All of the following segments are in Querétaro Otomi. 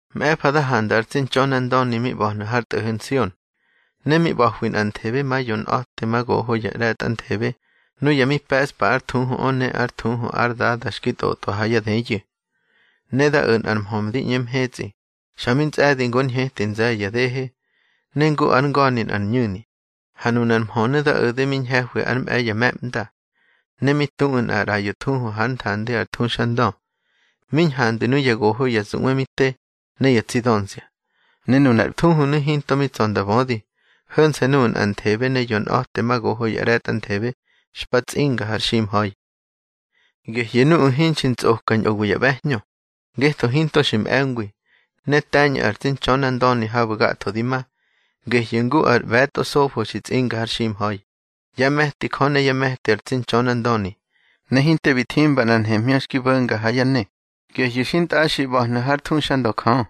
Mꞌe̱fa da handa ar tsi Ntxönandöni mi ꞌba̱hnu̱ har tꞌo̱ho̱ Nsion. Ne mi ꞌba̱hwi nꞌanthebe ma yonꞌa̱temagoho ya ꞌre̱tꞌanthebe nuya mi pe̱ꞌspa ár thuhuꞌö ne ár thuhu ár Dada xki tꞌotꞌa ha yá dëyu̱. Ne da o̱ nꞌar mhö ndi ꞌñe mhetsꞌi, xa mi ntsꞌe̱di ngu ár ñheti nze̱ye̱ ya dehe, ne ngu ár nga̱ni nꞌar ñu̱ni. Ha nunar mhönu̱ da o̱de mi ñhe̱hwi ár mꞌe̱i ya me̱ꞌmda. Ne mi tuꞌu̱ nꞌar ꞌraꞌyo thuhu hár nthandi ar thuxandö, mi ñhandwi nuya goho ya zuꞌwe mi te, ne ya tsi dönzia. Ne nunar thuhunu̱ hinto mi tsa̱ nda bödi, ho̱nse̱ nuꞌu̱ nꞌanthebe ne yonꞌa̱temagoho ya ꞌre̱tꞌanthebe xpa tsꞌinga har ximha̱i. Gehyu̱ nuꞌu̱ hinxi ntsꞌoka ñꞌowi ya ꞌbe̱hñö, ngetho hinto xi mꞌe̱ngwi. Ne te̱ñꞌu̱ ar tsi Ntxönandöni habu̱ gatho di ma. Gehyu̱ ngu ar ꞌbe̱tꞌo sofo xi tsꞌinga har ximha̱i, yá me̱ti Jö ne yá me̱ti ar tsi Ntxönandöni. Ne hinte bi thimba nꞌar nhemhñö xki bo̱nga ha yá ne, gehyu̱ xintꞌaxi ꞌba̱hnu̱ hár thuxandö Jö.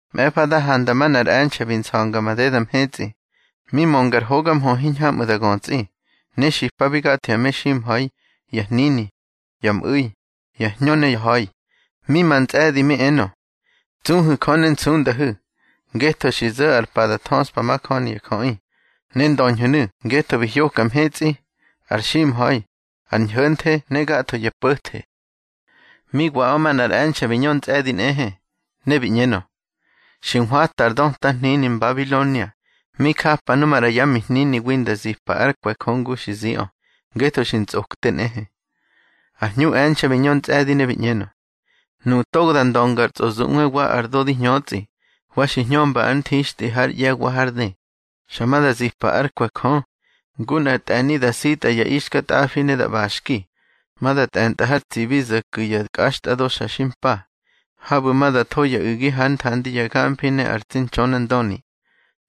Mꞌe̱fa da handa manꞌar e̱nxe̱ bi nsa̱nga madeda mhetsꞌi. Mi mönga ar hoga mhö hiñhamꞌu̱ da götsꞌi, ne xipabi gatho ya meximha̱i, ya hnini, ya mꞌu̱i, ya hñö ne ya ha̱i. Mi ma ntsꞌe̱di mi enö: —Tsuhu̱ Jö ne nsundahu̱, ngetho xi zo̱ ar pa da thöꞌspa majöni ya jöꞌi. Ne ndöñhu̱nu̱ ngetho bi hyoka mhetsꞌi, ar ximha̱i, ar ñho̱nthe ne gatho ya po̱the. Mi waꞌö, manꞌar e̱nxe̱ bi ñö ntsꞌe̱di nꞌehe, ne bi ꞌñenö: —Xi nhwata ar döta hnini Mbabilonia, mi japa nu maꞌra yá mihniniwi nda zipa ár kwe̱ Jö ngu xi ziꞌö, ngetho xi ntsꞌokte nꞌehe. Ar hñu e̱nxe̱ bi ñö ntsꞌe̱di, ne bi ꞌñenö: —Nuꞌu̱ togo da ndönga ar tsꞌozuꞌwe wa ar do di hñötsꞌi, wa xi hñömba ár nthixtꞌi hár ꞌye̱ wa hár dë, xa ma da zipa ár kwe̱ Jö, ngu nꞌar tꞌe̱ni da sitꞌa ya ixkatꞌafi ne da ꞌbaxki. Ma da tꞌe̱ntꞌa har tsibi zo̱ ku̱ ya kꞌaxtꞌado xa xi mpa, habu̱ ma da tho ya u̱gi hár nthandi ya gamfi ne ar tsi Ntxönandöni.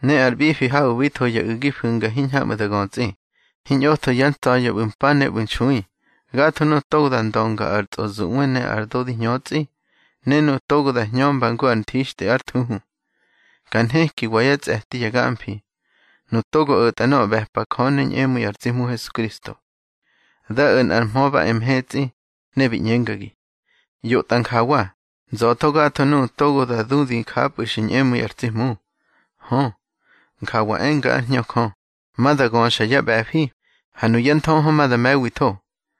Ne ar ꞌbifi habu̱ bi tho ya u̱gi fu̱nga hiñhamꞌu̱ da götsꞌi. Hiñꞌotho yá tsa̱ya̱ ꞌbu̱ mpa ne ꞌbu̱ nxui, gatho nuꞌu̱ togo da ndönga ar tsꞌozuꞌwe ne ar do di hñötsꞌi, ne nuꞌu̱ togo da hñömba ngu ar nthixtꞌi ár thuhu. Ka nhekiwa yá tsꞌe̱ti ya gamfi, nuꞌu̱ togo o̱tꞌa nöꞌö xi ꞌbe̱pa Jö ne ñꞌemu̱i ar tsi Hmu Hesukristo. Da o̱ nꞌar mhö ba e mhetsꞌi, ne bi ꞌñengagi: —ꞌYotꞌa njawa: Nza̱tho gatho nuꞌu̱ togo da du di njapꞌu̱ xi ñꞌemu̱i ar tsi Hmu. Hö, njawa enga ár Hñö Jö, ma da göxa yá ꞌbe̱fi, ha nuyá nthöhö ma da me̱witho.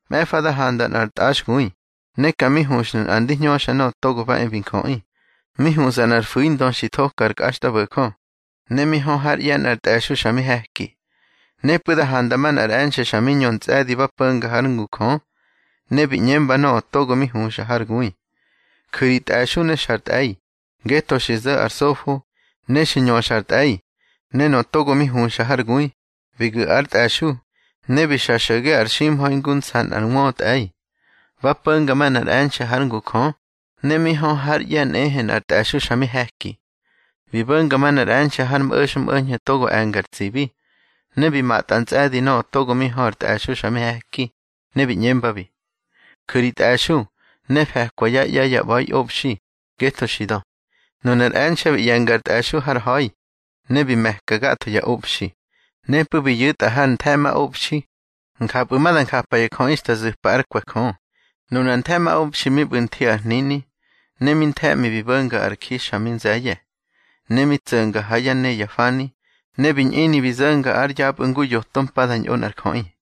Mꞌe̱fa da handa nꞌar tꞌaxgui, ne ka mi huxnu̱ nꞌa ndi hñöxa Nöꞌö Togo ba e bi Njöꞌi. Mi huꞌsa nꞌar fu̱indö xi thoka ar kꞌaxtꞌabo̱jö, ne mi hö hár ꞌye̱ nꞌar tꞌe̱xu̱ xa mi he̱ki. Nepꞌu̱ da handa manꞌar e̱nxe̱ xa mi ñö ntsꞌe̱di ba po̱nga hár ngu Jö, ne bi ꞌñemba nöꞌö togo mi huxa har gui: —Ju̱ ri tꞌe̱xu̱ ne xa ar tꞌe̱i, ngetho xi zo̱ ar sofo, ne xi ñöxa ar tꞌe̱i. Ne nöꞌö togo mi huxa har gui, bi gu̱ ár tꞌe̱xu̱, ne bi xa xo̱ge ar ximha̱i ngu nsa nꞌar wötꞌe̱i. Ba po̱nga manꞌar e̱nxe̱ hár ngu Jö, ne mi hö hár ꞌye̱ nꞌehe nꞌar tꞌe̱xu̱ xa mi he̱ki. Bi bo̱nga manꞌar e̱nxe̱ har mꞌo̱xmꞌo̱ñho̱ togo e̱nga ar tsibi, ne bi matꞌa ntsꞌe̱di nöꞌö togo mi hö ar tꞌe̱xu̱ xa mi he̱ki, ne bi ꞌñembabi: —Ju̱ ri tꞌe̱xu̱ ne fe̱kwa yá ꞌye̱ ya ꞌba̱iꞌobxi, ngetho xi dö. Nunar e̱nxe̱ bi ꞌye̱nga ár tꞌe̱xu̱ har ha̱i, ne bi me̱ka gatho ya obxi, nepꞌu̱ bi ꞌyu̱tꞌa har nthe̱ꞌmaꞌobxi. Njapꞌu̱ ma da njapa ya jöꞌi xta zu̱pa ár kwe̱ Jö. Nunar nthe̱ꞌmaꞌobxi mi ꞌbu̱ nthi ar hnini, ne mi nthe̱ꞌmi bi bo̱nga ar ji xa mi nze̱ye̱, ne mi tso̱nga ha yá ne ya fani, ne bi ñꞌini bi zo̱nga ár yapꞌu̱ ngu yoto mpa da ñꞌo nꞌar jöꞌi.